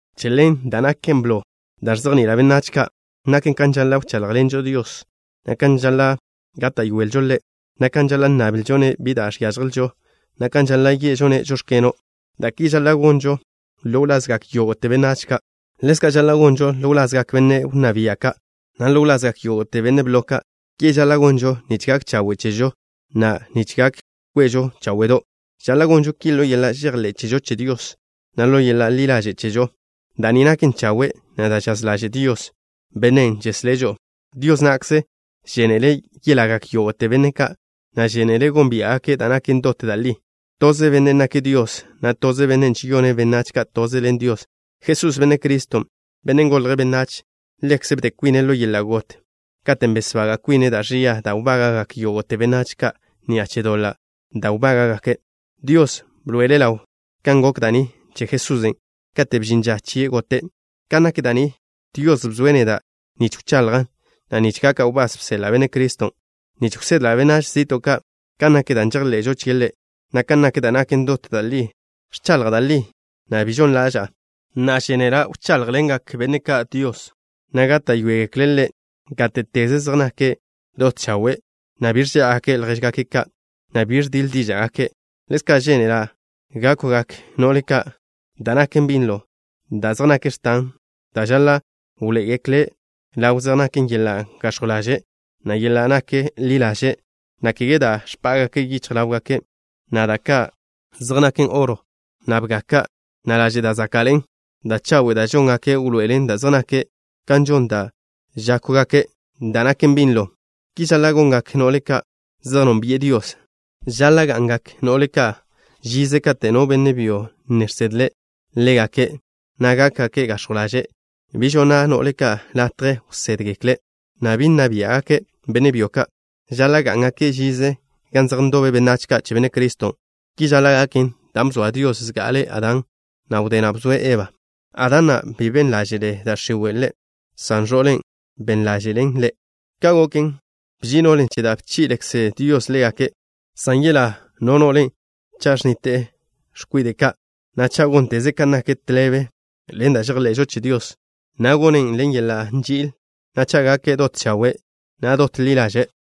Che ḻen da' naken blo da' ẕzejni'ila' benách ka' naken kan žaḻa' wcháḻjḻenžo Dios, na' kan žaḻa' gáta'yoelžo Ḻe', na' kan žaḻa' nnablžo-ne' bi da' žiážjelžo, na' kan žaḻa' ye'žo-ne': “Žóx̱keno'.” Da' ki žaḻa' gonžo ḻo wlazgak yógo'te benách ka'. Ḻezka' žaḻa' gonžo ḻo wlazgak benne' wnná bia' ka', na' ḻo wlazgak yógo'te benne' blo ka'. Ki žaḻa' gonžo nich gak chawe' chežo, na' nich gak kwezžo cháwe'do'. Žaḻa' gonžo ki ḻo yeḻa' žejḻé' chežo che Dios, na' ḻo yeḻa' ḻi ḻaže' chežo. Da' ni naken chawe', na' da' žaz ḻaže' Dios, Bennen' žeslé' žo'o. Dios na'kze žénele' yelagak yógo'te benne' ka', na' žénele' gónbia'gake' da' naken dot da' li. Toze Benne' nake' Dios, na' toze Benne' žeyone' benách ka' toze ḻen Dios, Jesús, Benne' Criston', Bennen' golje' benách. Ḻekze' bde kwine' ḻo yeḻa' got, katen' besbaga' kwine' da' ẕia da' wbága'gak yógo'te benách ka' ni'a che doḻa' da' wbága'gake'. Dios bḻoe'ele' ḻaw kan gok da' ni che Jesusen' katen' bžin ža chie' gote'. Kan nak da' ni, Dios bzoe' neda' nich wchaḻjan', na' nich gaka' wbás bseḻa' Benne' Criston', nich wsedla' benách zi'to' ka' kan nak da' žejḻe'žo chie' Ḻe', na' kan nak da' naken dot da' li. Ẕchaḻja' da' li, na' bi žon ḻaža'a. Na'a, žénela' wcháḻjḻengak benne' ka' Dios, na' gáta'yoegekle' Ḻe' gáte'teze, zej nake' dot chawe', na' bi ẕžá'agake' ljéžgake' ka', na' bi ẕdiḻ díža'gake'. Ḻezka', žénela' gákwgak no'le ka' da' naken binlo. Da' zej nak x̱tan da' žaḻa' wḻoé'egekle' ḻaw zej naken yeḻa' gax̱jw ḻaže', na' yeḻa' nak ḻi ḻaže', na' kege da' ẕpá'gake' yichj ḻáwgake', na' da' ka' zej naken oro, na' bga ka', na' laže' da' záka'ḻe'en. Da' chawe' da' žóngake' wḻoé'elen da' zej nake', kan žon da' žákwgake' da' naken binlo. Ki žaḻa' gongak no'le ka' zej nónbi'e Dios. Žaḻa' ga'ngak no'le ka' žize kate' no benne' byo ne žsedle' ḻégake', na' gákgake' gax̱jw ḻaže'. Bi žonna' no'le ka' latje wsédgekle', na' bi nna biá'gake' benne' byo ka'. Žaḻa' gá'ngake' žize gan zej ndobe benách ka' che Benne' Criston'. Ki žaḻa' gaken dan' bzoa Dios zga'ale Adán, na' wdé na' bzoe' Eba. Adán na', bi ben ḻáže'le da' x̱iwe' ḻe', san ẕo'len', ben ḻáže'len ḻe'. Ka' goken, bži'i no'len' che da' bchi'lekze Dios ḻégake', san yelá no no'le cha' ẕnnite'e x̱kwide' ka', na' cha' gónteze' kan nak tḻebe ḻen da' žejḻe'žo che Dios, na' gonen' ḻen yeḻa' nži'il, na' cha' gake' dot chawe', na' dot ḻi ḻaže'.